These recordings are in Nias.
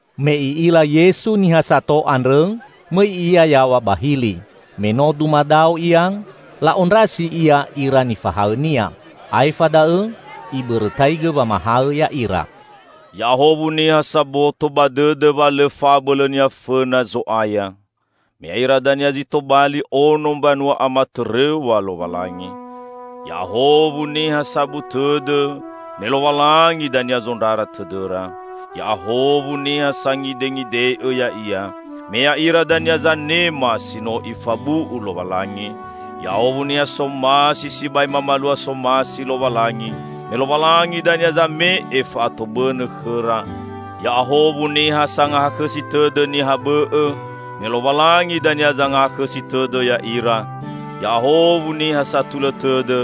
Me I'ila Yesu niha sato andrõ, mõi Ia yaw̃a ba hili. Me no dumadao Ia, la'ondrasi Ia ira nifahaõ-Nia. Aefa da'õ Ibõrõtaigõ wamahaõ ya'ira: "Ya'ahowu niha saboto ba dõdõ wa lõ fa'abõlõnia fõna Zo'aya; me ya'ira dania zi tobali ono mbanua amatõrõw̃a Lowalangi! Ya'ahowu niha sabu tõdõ; me Lowalangi dania zondrara tõdõra! Ya'ahowu niha sangidengide'õ ya'ia; me ya'ira dania zanema si no Ifabu'u Lowalangi! Ya'ahowu niha somasi sibai mamalua somasi Lowalangi; me Lowalangi dania zame'e fa'atobõnõ khõra! Ya'ahowu niha sangahakhõsi tõdõ niha bõ'õ; me Lowalangi dania zangahakhõsi tõdõ ya'ira! Ya'ahowu niha satulõ tõdõ;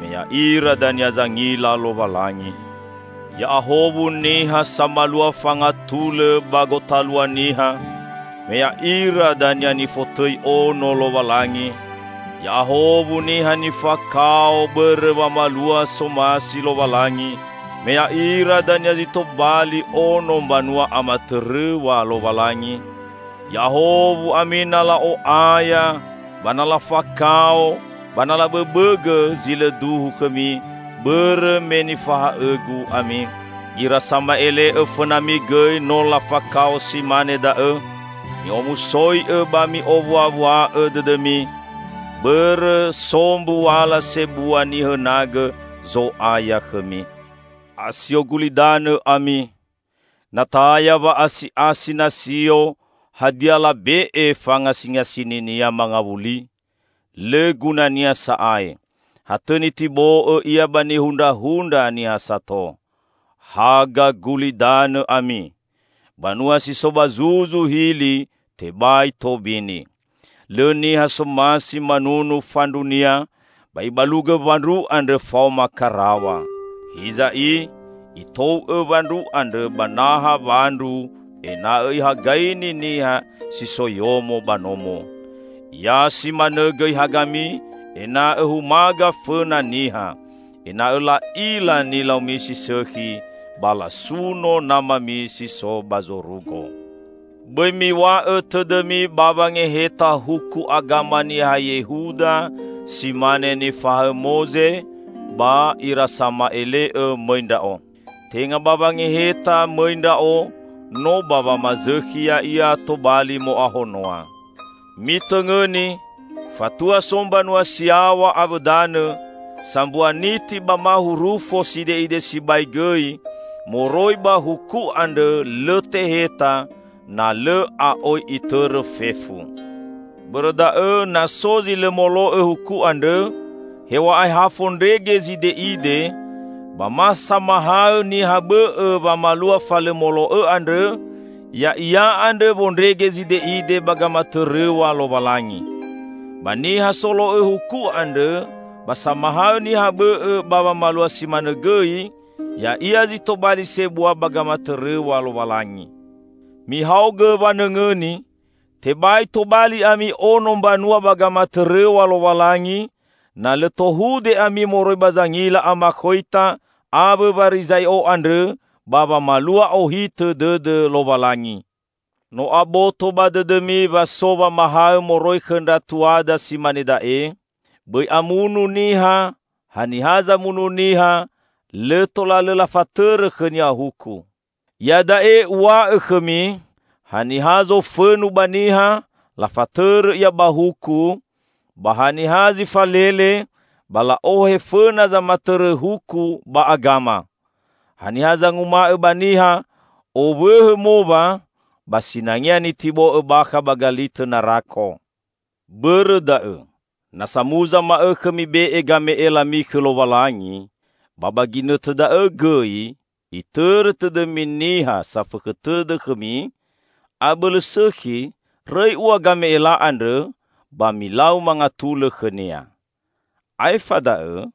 me ya'ira dania zangila Lowalangi! Ya'ahowu niha samalua fangatulõ ba gotalua niha; me ya'ira dania nifotõi Ono Lowalangi! Ya'ahowu niha nifakao bõrõ wamalua somasi Lowalangi; me ya'ira dania zi tobali ono mbanua amatõrõw̃a Lowalangi! Ya'ahowu ami na la'o'aya, ba na lafakao, ba na labõbõgõ zi lõ duhu khõmi, bõrõ me nifahaõ-Gu ami. Ira sama'ele'õ fõnami gõi no lafakao si mane da'õ. Mi'omusoi'õ ba mi'owuawua'õ dõdõmi; bõrõ so mbuala sebua nihõnagõ Zo'aya khõmi." "Asio gulidanõ ami. Na taya wa'asi'asi nasio, hadia labe'e fangasingasininia mangawuli? Lõ gunania sa'ae. Ha tõ nitibo'õ ia ba nihundrahundra niha sato. Haga gulidanõ ami. Banua si so ba zuzu hili tebai tobini. Lõ niha somasi manunu fandrunia, ba ibalugõ wandru andrõ faoma karaw̃a. Hiza i, itou'õ wandru andrõ ba naha wandru ena'õ ihagaini niha si so yomo ba nomo. Ya simanõ gõi hagami ena'õ humaga fõna niha, ena'õ la'ila nilaumi si sõkhi, ba lasuno Namami si so ba zorugo." "Bõi miw̃a'õ tõdõmi ba wangeheta huku agama niha Yehuda si mane nifahaõ Moze ba ira sama'ele'õ mõi Ndra'o. Tenga ba wangeheta mõi Ndra'o, no ba wamazõkhi ya'ia tobali mo'ahonoa. Mitõngõni! Fatua so mbanua si yaw̃a awõ danõ, sambua niti ba ma hurufo side'ide sibai gõi moroi ba huku andrõ lõ teheta, na lõ a'oi itõrõ fefu! Bõrõ da'õ, na so zi lõ molo'õ huku andrõ, hew̃a'ae ha fondrege zide'ide, ba ma samahaõ niha bõ'õ wamalua fa lõ molo'õ andrõ, ya'ia andrõ wondrege zide'ide ba gamatõrõw̃a Lowalangi. Ba niha solo'õ huku andrõ ba samahaõ niha bõ'õ ba wamalua si manõ gõi, ya'ia zi tobali sebua ba gamatõrõw̃a Lowalangi. Mihaogõ wanõngõni: Tebai tobali ami ono mbanua ba gamatõrõw̃a Lowalangi, na lõ tohude ami moroi ba zangila amakhoita awõ Warizai'o andrõ ba wamalua ohitõ dõdõ Lowalangi!" "No aboto ba dõdõmi wa so wamahaõ moroi khõ ndra tuada si mane da'e: Bõi amunu niha, haniha zamunu niha, lõ tola lõ lafatõrõ khõnia huku. Iada'e Uw̃a'õ khõmi, haniha zofõnu ba niha, lafatõrõ ia ba huku; ba haniha zi falele, ba la'ohe fõna zamatõrõ huku ba agama. Haniha zanguma'õ ba niha, 'Owõhõ mowa' ba sinangea nitibo'õ bakha ba galitõ narako. Bõrõ da'õ, na samuza ma'õkhõ mibe'e game'elami khõ Lowalangi, ba ba ginõtõ da'õ gõi itõrõ tõdõmi niha safõkhõ tõdõ khõmi, abõlõ sõkhi, rõi ua game'ela andrõ, ba milau mangatulõ khõnia. Aefa da'õ,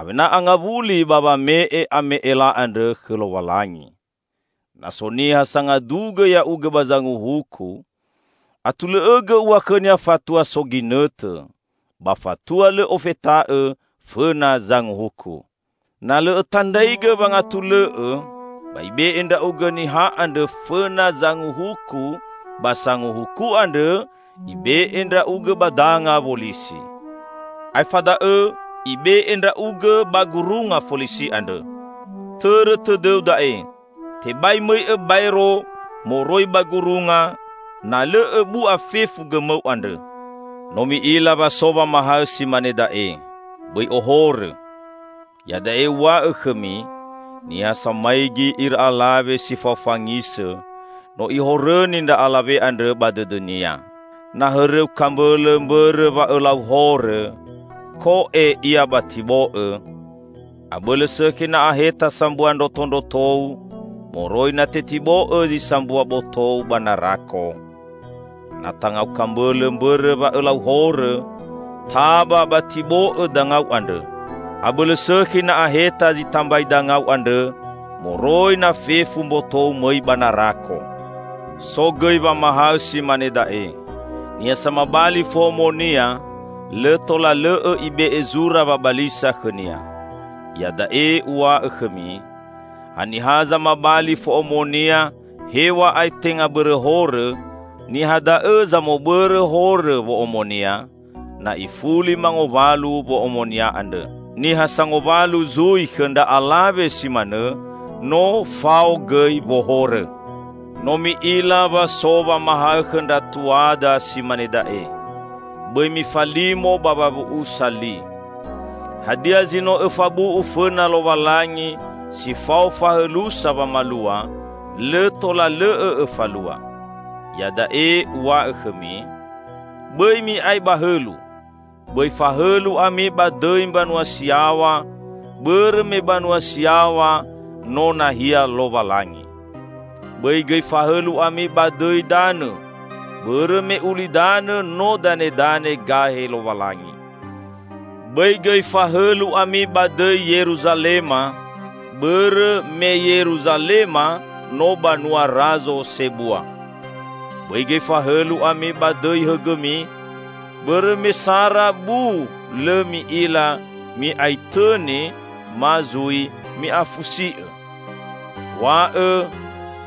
awena angawuli ba wame'e ame'ela andrõ khõ Lowalangi. Na so niha sangadugõ ya'ugõ ba zanguhuku, atulõ'õgõ ua khõnia fatua so ginõtõ, ba fatua lõ ofeta'õ fõna zangahuku. Na lõ õtandraigõ wangatulõ'õ, ba ibe'e ndra'ugõ niha andrõ fõna zangahuku ba sanguhuku andrõ ibe'e ndra'ugõ ba danga wolisi. Aefa da'õ ibe'e ndra'ugõ ba gurunga folisi andrõ. Tõrõ tõdõu da'e: Tebai mõi'õ baero moroi ba gurunga, na lõ õbu'a fefu gõmõu andrõ." "No mi'ila wa so wamahaõ si mane da'e: Bõi ohorõ. Iada'e Uw̃a'õ khõmi: niha samaigi ira alawe si fao fangisõ, no ihorõni ndra alawe andrõ ba dõdõnia. Na hõrõu kambõlõ mbõrõ wa õlau horõ, ko'e ia ba tibo'õ! Abõlõ sõkhi na aheta sambua ndrotondrotou, moroi na tetibo'õ zi sambua botou ba narako. Na tangau kambõlõ mbõrõ wa õlau horõ, taba ba tibo'õ dangau andrõ! Abõlõ sõkhi na aheta zi tambai dangau andrõ moroi na fefu mbotou mõi ba narako." "So gõi wamahaõ si mane da'e: niha samabali fo'omonia, lõ tola lõ'õ ibe'e zura wabalisa khõnia. Iada'e Uw̃a'õ khõmi: haniha zamabali fo'omonia hew̃a'ae tenga bõrõ horõ, niha da'õ zamobõrõ horõ wo'omonia, na ifuli mangowalu wo'omonia andrõ. Niha sangowalu zui khõ ndra alawe si manõ, no fao gõi wohorõ." "No mi'ila wa so wamahaõ khõ ndra tuada si mane da'e: bõi mifalimo ba wawu'usa li. Hadia zi no õfabu'u fõna Lowalangi si fao fahõlusa wamalua, lõ tola lõ'õ õfalua. Iada'e Uw̃a'õ khõmi: bõi mi'ae ba hõlu. Bõi fahõlu ami ba dõi mbanua si yaw̃a, bõrõ me banua si yaw̃a no nahia Lowalangi. Bõi gõi fahõlu ami ba dõi danõ, bõrõ me ulidanõ no danedane gahe Lowalangi; bõi gõi fahõlu ami ba dõi Yeruzalema, bõrõ me Yeruzalema no banua razo sebua. Bõi gõi fahõlu ami ba dõi hõgõmi, bõrõ me sara bu lõ mi'ila mi'aitõni ma zui mi'afusi'õ. &Wa'õ,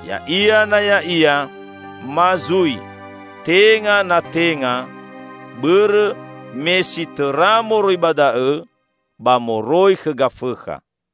'Ya'ia na ya'ia' ma zui 'Tenga na tenga' -- bõrõ me si tõra moroi ba da'õ ba moroi khõ Gafõkha."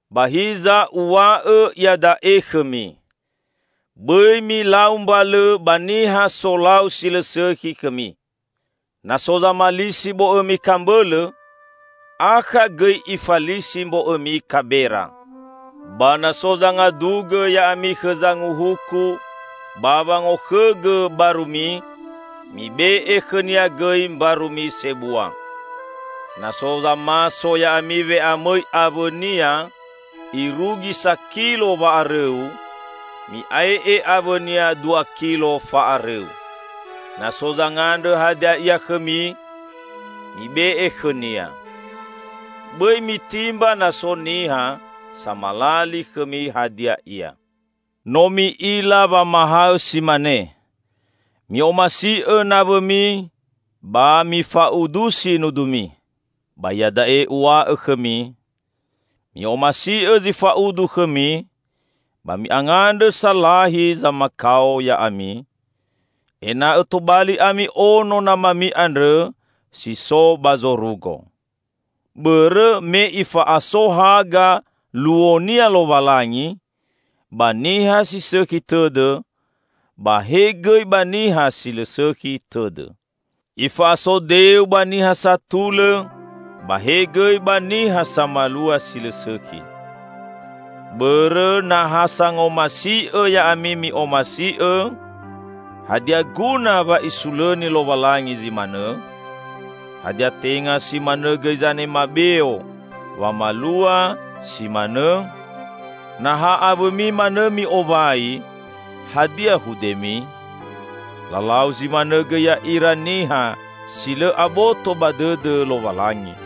Ba hiza Uw̃a'õ iada'e khõmi: bõi milau mbalõ ba niha solau si lõ sõkhi khõmi. Na so zamalisi bo'õmi kambõlõ, akha gõi ifalisi mbo'õmi kabera. Ba na so zangadugõ ya'ami khõ zanguhuku ba wangokhõgõ barumi, mibe'e khõnia gõi mbarumi sebua. Na so zamaso ya'ami we'amõi awõnia irugi sakilo wa'arõu, mi'ae'e awõnia dua kilo fa'arõu. Na so zangandrõ hadia ia khõmi, mibe'e khõnia. Bõi mitimba na so niha samalali khõmi hadia ia." "No mi'ila wamahaõ si mane: mi'omasi'õ nawõmi ba mifa'udusi nudumi. Ba iada'e Uw̃a'õ khõmi: mi'omasi'õ zi fa'udu khõmi, ba mi'angandrõ salahi zamakao ya'ami, ena'õ tobali ami Ono Namami andrõ si so ba zorugo. Bõrõ me Ifa'aso haga luo-Nia Lowalangi ba niha si sõkhi tõdõ ba he gõi ba niha si lõ sõkhi tõdõ. Ifa'aso deu ba niha satulõ ba he gõi ba niha samalua si lõ sõkhi. Bõrõ na ha sangomasi'õ ya'ami mi'omasi'õ, hadia guna wa Isulõni Lowalangi zi manõ? Hadia tenga si manõ gõi zanema beo wamalua si manõ? Na ha awõmi manõ mi'owai, hadia hudemi? Lalau zi manõ gõi ya'ira niha si lõ aboto ba dõdõ Lowalangi!